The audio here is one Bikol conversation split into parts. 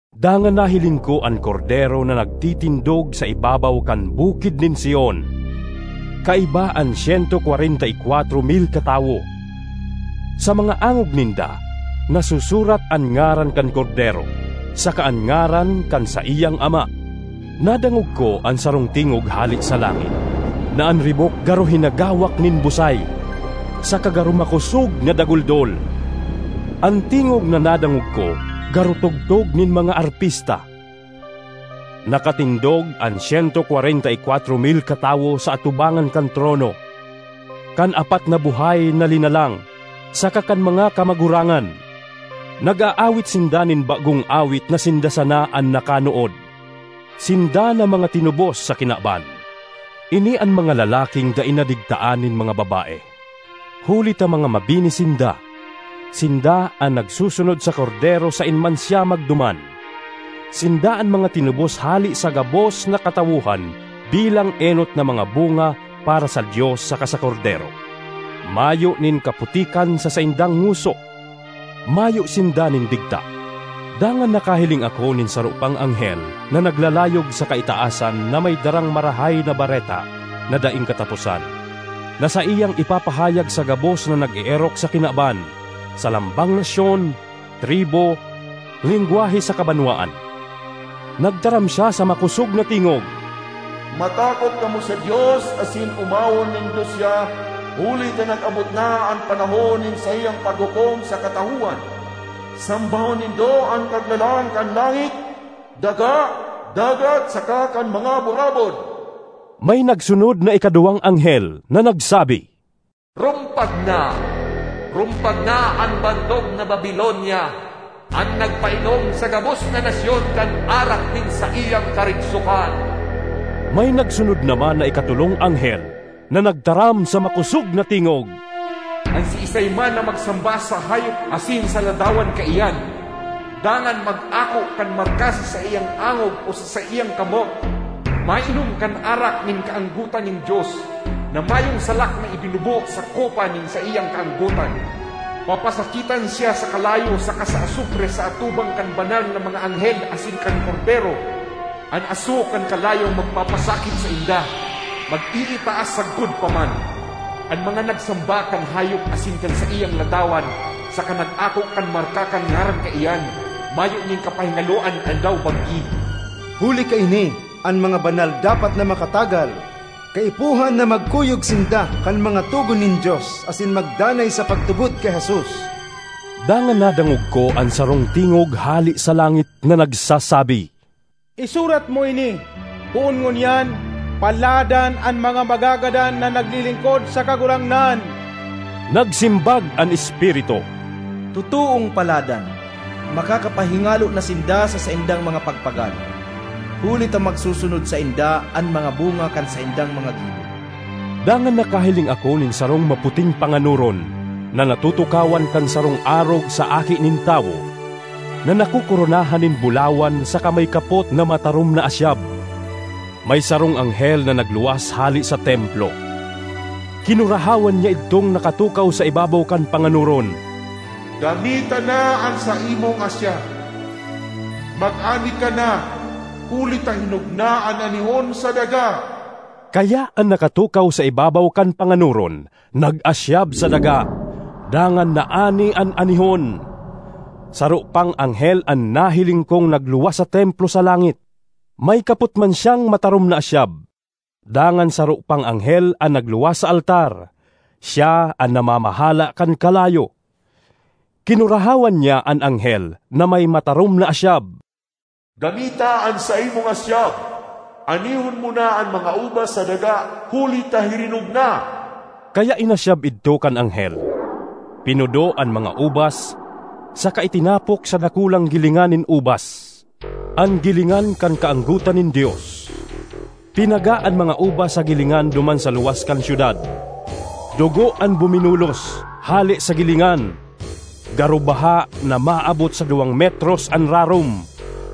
Dangan nahiling ko an Kordero na nagtitindog sa ibabaw kan Bukid nin Sion, kaiba an syento kwarenta y kwatro mil katawo; sa mga angog ninda nasusurat an ngaran kan Kordero saka an ngaran kan saiyang Ama. Nadangog ko an sarong tingog hale sa langit na an ribok garo hinagawak nin busay, saka garo makosog na daguldol. An tingog na nadangog ko garo tugtog nin mga arpista. Nakatindog an syento kwarenta y kwatro mil katawo sa atubangan kan trono, kan apat na buhay na linalang saka kan mga kamagurangan; nag-aawit sinda nin bagong awit na sinda sana an nakanood, sinda na mga tinubos sa kinaban. Ini an mga lalaking dai nadigtaan nin mga babae, huli ta mga mabini sinda; sinda an nagsusunod sa Kordero saen man siya magduman. Sinda an mga tinubos hale sa gabos na katawohan bilang enot na mga bunga para sa Dios saka sa Kordero. Mayo nin kaputikan sa saindang ngoso; mayo sinda nin digta. Dangan nakahiling ako nin saro pang anghel na naglalayog sa kaitaasan na may darang Marahay na Bareta na daing kataposan, na saiyang ipapahayag sa gabos na nag-eerok sa kinaban, sa lambang nasyon, tribu, lengwahe saka banwaan. Nagtaram siya sa makosog na tingog, “Matakot kamo sa Dios asin omawon nindo siya, huli ta nag-abot na an panahon nin saiyang paghukom sa katawohan. Sambahon nindo an Kaglalang kan langit, daga, dagat saka kan mga burabod!” May nagsunod na ikaduwang anghel na nagsabi, “Rumpag na! Rumpag na an bantog na Babilonia, an nagpainom sa gabos na nasyon kan arak nin saiyang karigsokan.” May nagsunod naman na ikatolong anghel na nagtaram sa makosog na tingog, “An siisay man na magsamba sa hayop asin sa ladawan kaiyan, dangan mag-ako kan marka sa saiyang angog o sa saiyang kamot, mainom kan arak nin kaanggotan nin Dios—na mayong salak na ibinubo sa kopa nin saiyang kaanggotan. Papasakitan siya sa kalayo saka sa asupre sa atubang kan banal na mga anghel asin kan Kordero. An aso kan kalayong magpapasakit sainda, mag-iitaas sagkod pa man. An mga nagsamba kan hayop asin kan saiyang ladawan, saka nag-ako kan marka kan ngaran kaiyan, mayo nin kapahingaloan aldaw-banggi.” Huli kaini, an mga banal dapat na makatagal; kaipuhan na magkuyog sinda kan mga togon nin Dios asin magdanay sa pagtubod ki Jesus. Dangan nadangog ko an sarong tingog hale sa langit na nagsasabi, “Isurat mo ini: Poon ngunyan, paladan an mga magagadan na naglilingkod sa Kagurangnan!” Nagsimbag an Espiritu, “Totoong paladan! Makakapahingalo na sinda sa saindang mga pagpagal, huli ta magsusunod sainda an mga bunga kan saindang mga gibo.” Dangan nakahiling ako nin sarong maputing panganoron na natutukawan kan sarong arog sa aki nin tawo na nakokoronahan nin bulawan saka may kapot na matarom na asyab. May sarong anghel na nagluwas hale sa templo; kinurahawan niya idtong nakatukaw sa ibabaw kan panganoron, “Gamita na an saimong asyab, mag-ani ka na huli ta hinog na an anihon sa daga!” Kaya an nakatukaw sa ibabaw kan panganoron nag-asyab sa daga, dangan naani an anihon. Saro pang anghel an nahiling kong nagluwas sa templo sa langit; may kapot man siyang matarom na asyab. Dangan saro pang anghel an nagluwas sa altar. Siya an namamahala kan kalayo. Kinurahawan niya an anghel na may matarom na asyab, “Gamita an saimong asyab; anihon mo na an mga ubas sa daga, huli ta hirinog na!” Kaya inasyab idto kan anghel, pinudo an mga ubas saka itinapok sa dakulang gilingan nin ubas—an gilingan kan kaanggotan nin Dios. Pinaga an mga ubas sa gilingan duman sa luwas kan syudad; dugo an buminulos, hale sa gilingan, garo baha na maabot sa duwang metros an rarom,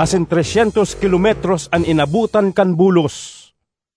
asin tres syentos kilometros an inabotan kan bulos.